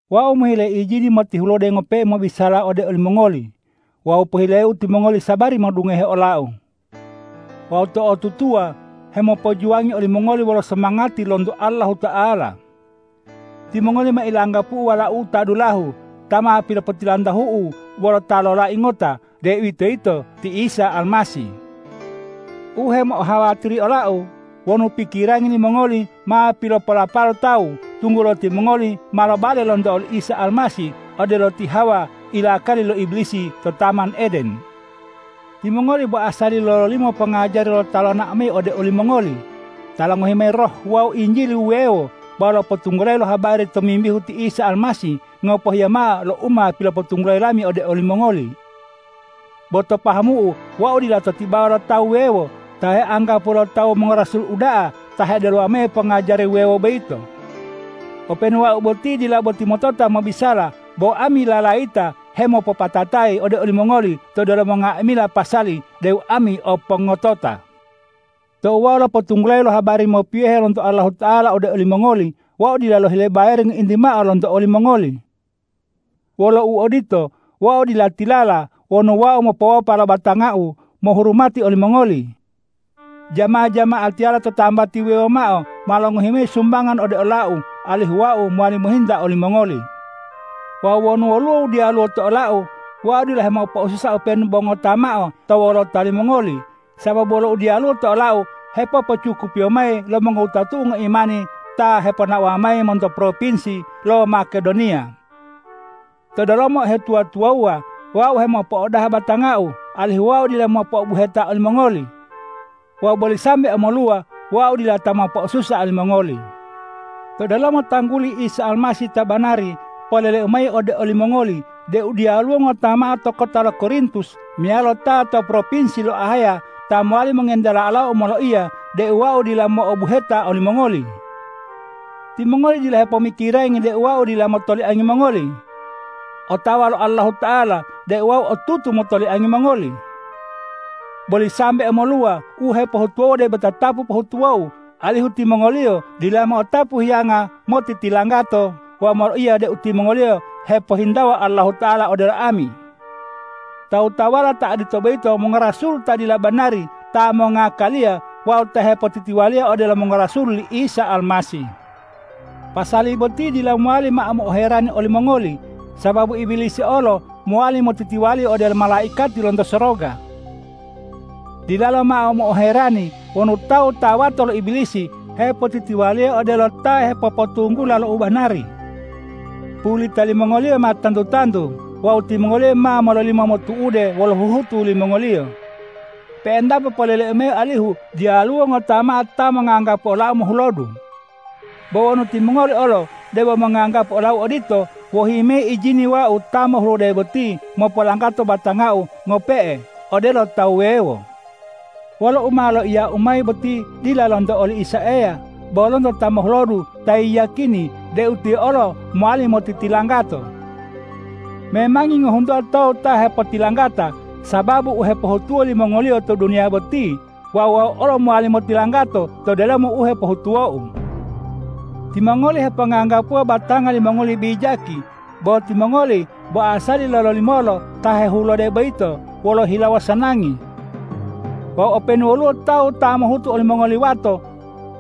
Wau mohile ijini motihulode ngope'e mobisala ode olimongoli. Wawu pohileu timongoli sabari modungohe olau. Wau to'otutuwa hemopojuwangi olimongoli wolo somangati lonto Allahuta'ala. Timongoli ma ilanggapu'u walau'u ta dulahu ta ma pilopotilantahu'u wolo ta lolai ngota, deuwitoyito ti Isa Almasih. U hemo'ohawatiri olau wonu pikirangi limongoli ma pilopolapalo tawu, tunggulo timongoli ma lobale lonto oli Isa Almasih odelo ti Hawa ilakali lo Ibilisi to taman Eden. Timongoli bo asali lololimolo pongajari lo ta lonao mayi ode olimongoli, ta longohi mayi roh wawu injili wuwewo wawu lopotunggulayi lo habari tomimbihu ti Isa Almasih ngopohiya mao lo u ma pilopotunggulayi lami ode olimongoli. Bo to pahamu'u wau dila to tibawa lo tawu wuwewo ta heanggapuwo lo tawu mongorasul uda'a ta hedelowa mayi pongajari wuwewo boyito. Openu wau boti dila boti motota mobisala, bo ami lalayita hemopopatatayi ode olimongoli to delomo nga'amila pasali deu ami o pongotota. Tou wau lopotunggulayi lo habari mopiyohe lonto Allahuta'ala ode olimongoli, wau dila lohile bayari ngointi mao lonto olimongoli. Wolo uodito, wau dila tilala wonu wau mopowopa lo batangau mohurumati olimongoli. Jama-jama'atiyala to tambati wuwewo mao ma longohi mayi sumbangan ode olau, alihu wau mowali mohinta olimongoli. Wawu wonu woluwo u diyaluwo to olau, wau dila hemopo'osusa openu bo ngota mao to wolota limongoli, sababu wolo u diyaluwo to olau hepopocukupiyo mayi lo mongowutatu'u ngoimani ta heponaowa mayi monto propinsi lo Makedoniya. To delomo uhetuwa-tuwawuwa wau hemopo'odaha batangau, alihu wau dila mo'obuheta olimongoli. Wawu boli sambe omoluwa, wau dila ta mopo'osusa olimongoli. To delomo tangguli Isa Almasih ta banari poleleu mayi ode olimongoli deu diyaluwo ngota mao to kota lo Korintus meyalo ta to propinsi lo Ahaya ta mowali mongentela olau moloiya deu wau dila mo'obuheta olimongoli. Timongoli dila hepomikirangi deu wau dila motoliangi mongoli. Otawa lo Allahuta'ala deu wau otutu motoliangi mongoli. Boli sambe omoluwa, u hepohutuwou debo tatapu pohutuwou, alihu timongoliyo dila mo'otapu hiyanga motitilanggato wawu moloiya deu timongoliyo hepohintawa Allahuta'ala odelo ami. Tawu-tawuwala ta odito boyito mongorasul ta dila banari ta mongakaliya wawu ta hepotitiwaliya odelo mongorasul li Isa Almasih. Pasali boti dila mowali mao mo'oherani olimongoli, sababu Ibilisi olo mowali motitiwali odelo malaikati lonto soroga. Dilalo mao mo'oherani wonu tawu ta wato lo Ibilisi hepotitiwaliya odelo ta hepopotunggula lo u banari. Pulita limongoliyo ma tantu-tantu wawu timongoliyo ma mololimo motu'ude wolo huhutu limongoliyo. Pe'entapo poleleu mayi alihu diyaluwo ngota mao ta monganggapu olau mohulodu. Bo wonu timongoli olo debo monganggapu olau odito, wohi mayi ijini wau ta mohulode boti mopolanggato batangau ngope'e odelo tawu wuwewo. Wolo u ma loiyau mayi boti dila lonto oli Isa Eya, bo lonto ta mohulodu ta yiyakini deu tiyo olo mowali motitilanggato. Memangi ngohuntuwa tawu ta hepotilanggata sababu u hepohutuwo limongoliyo to duniya boti wawu wau olo mowali motilanggato to delomo u hepohutuwou. Timongoli heponganggapuwa batanga limongoli bijaki, bo timongoli bo asali lololimolo ta hehulode boyito wolo hilawo sanangi. Wawu openu woluwo tawu ta mopohutu olimongoli wato,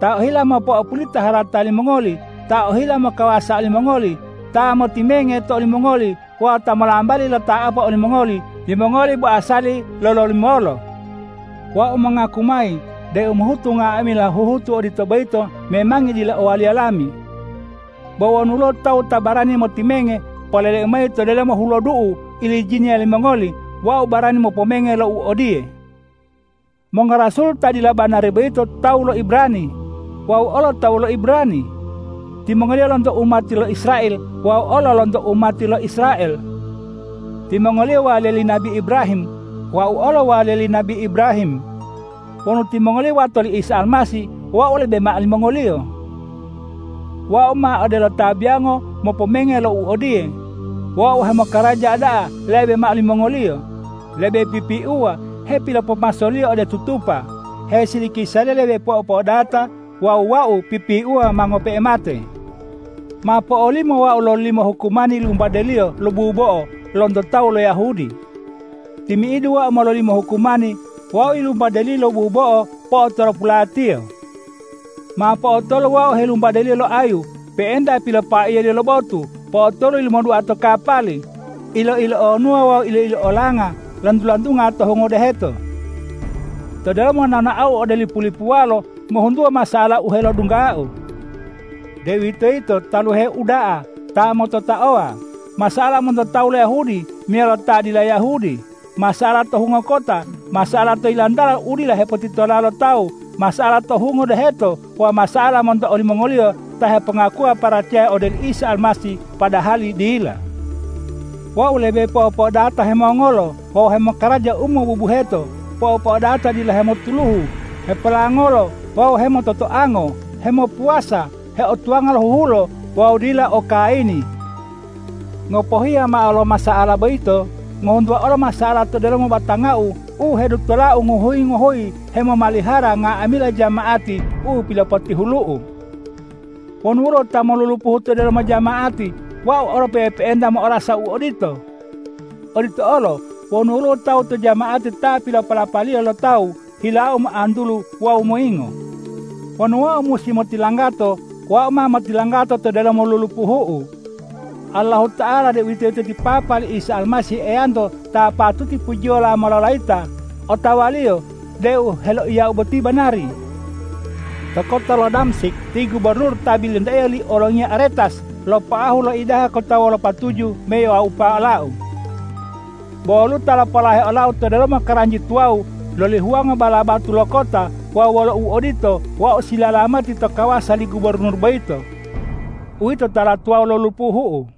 ta ohila mopo'opulita harata limongoli, ta ohila mokawasa olimongoli, ta motimenge to olimongoli wawu ta molambali lota'apo olimongoli, timongoli bo asali lololimolo. Wau mongaku mayi deu mohutu nga'amila huhutu odito boyito memangi dila owaliya lami. Bo wonu woluwo tawu ta barani motimenge, poleleu mayi to delomo hulodu'u u ilijiniya limongoli: Wau barani mopomenge lo u odiye. Mongorasul ta dila banari boyito tawu lo Ibrani; wau olo tawu lo Ibrani. Timongoliyo lonto umati lo Israel; wau olo lonto umati lo Israel. Timongoliyo waliya li nabi Ibrahim; wau olo waliya li nabi Ibrahim. Wonu timongoliyo wato li Isa Almasih, wau lebe mao limongoliyo. Wau ma odelo ta biyongo mopomenge lo u odiye: Wau hemokaraja da'a lebe mao limongoliyo, lebe pipiuwa hepilopomasoliyo ode tutupa, hesilikisaliyo lebe po'opo'odata wawu wau pipiuwa ma ngope'e mate. Ma po'olimo wau lololimo hukumani yilumbadeliyo lo bubo'o lonto tawu lo Yahudi. Timi'idu wau mololimo hukumani, wau wumbadeliyo lo bubo'o po'otolopulatiyo. Ma po'otolu wau heyilumbadeliyo lo ayu, pe'enta pilopaiyaliyo lo botu, po'otolu yilumodua to kapali, ilo-ilonuwa wawu ilo-ilolanga lantu-lantunga to hungo deheto. To delomo nonaou ode lipu-lipuwalo ngohuntuwa masa'ala u heodunggau, deuwitoyito taluhe uda'a, ta mototaowa, masa'ala monto tawu lo Yahudi meyalo ta dila Yahudi, masa'ala to hungo kota, masa'ala to yilantala u dila hepotitola lo tawu, masa'ala to hungo deheto wawu masa'ala monto olimongoliyo ta hepongakuwa paracaya ode oli Isa Almasih padahali dila. Wau lebe po'opo'odata hemongolo wawu hemokaraja u mobubuheto, po'opo'odata dila hemotuluhu, hepolangolo wawu hemototoango, hemopuwasa, heotuwanga lo huhulo wawu dila o kayini. Ngopohiya mao lo masa'ala boyito ngohuntuwa olo masa'ala to delomo batangau u hedutolau ngohuyi-ngohuyi hemomalihara nga'amila jama'ati u pilopotihulu'u. Wonu woluwo ta molulupuhu to delomo jama'ati, wau olo pe'epe'enta mo'orasa u odito. Odito olo wonu woluwo tawu to jama'ati ta pilopolapaliyo lo tawu, hilau moantulu wawu moyingo. Wonu wau musi motilanggato, wau ma motilanggato to delomo lulupuhu'u. Allahuta'ala, deuwitoyito ti Papa li Isa Almasih Eyanto ta patuti pujiyolo mololayita, otawa-Liyo deu u heloiyau boti banari. To kota lo Damsik ti gubornur ta bilintaiyo li olongiya Aretas lopoahu loidaha kota wolo patuju moiwaupa olau. Bo woluwo ta lopolahe olau to delomo karanji tuwawu loli huwango bala batu lo kota wawu wolo uodito, wau silalamati to kawasa li gubornur boyito. Uwito tala tuwawu lo lupuhu'u.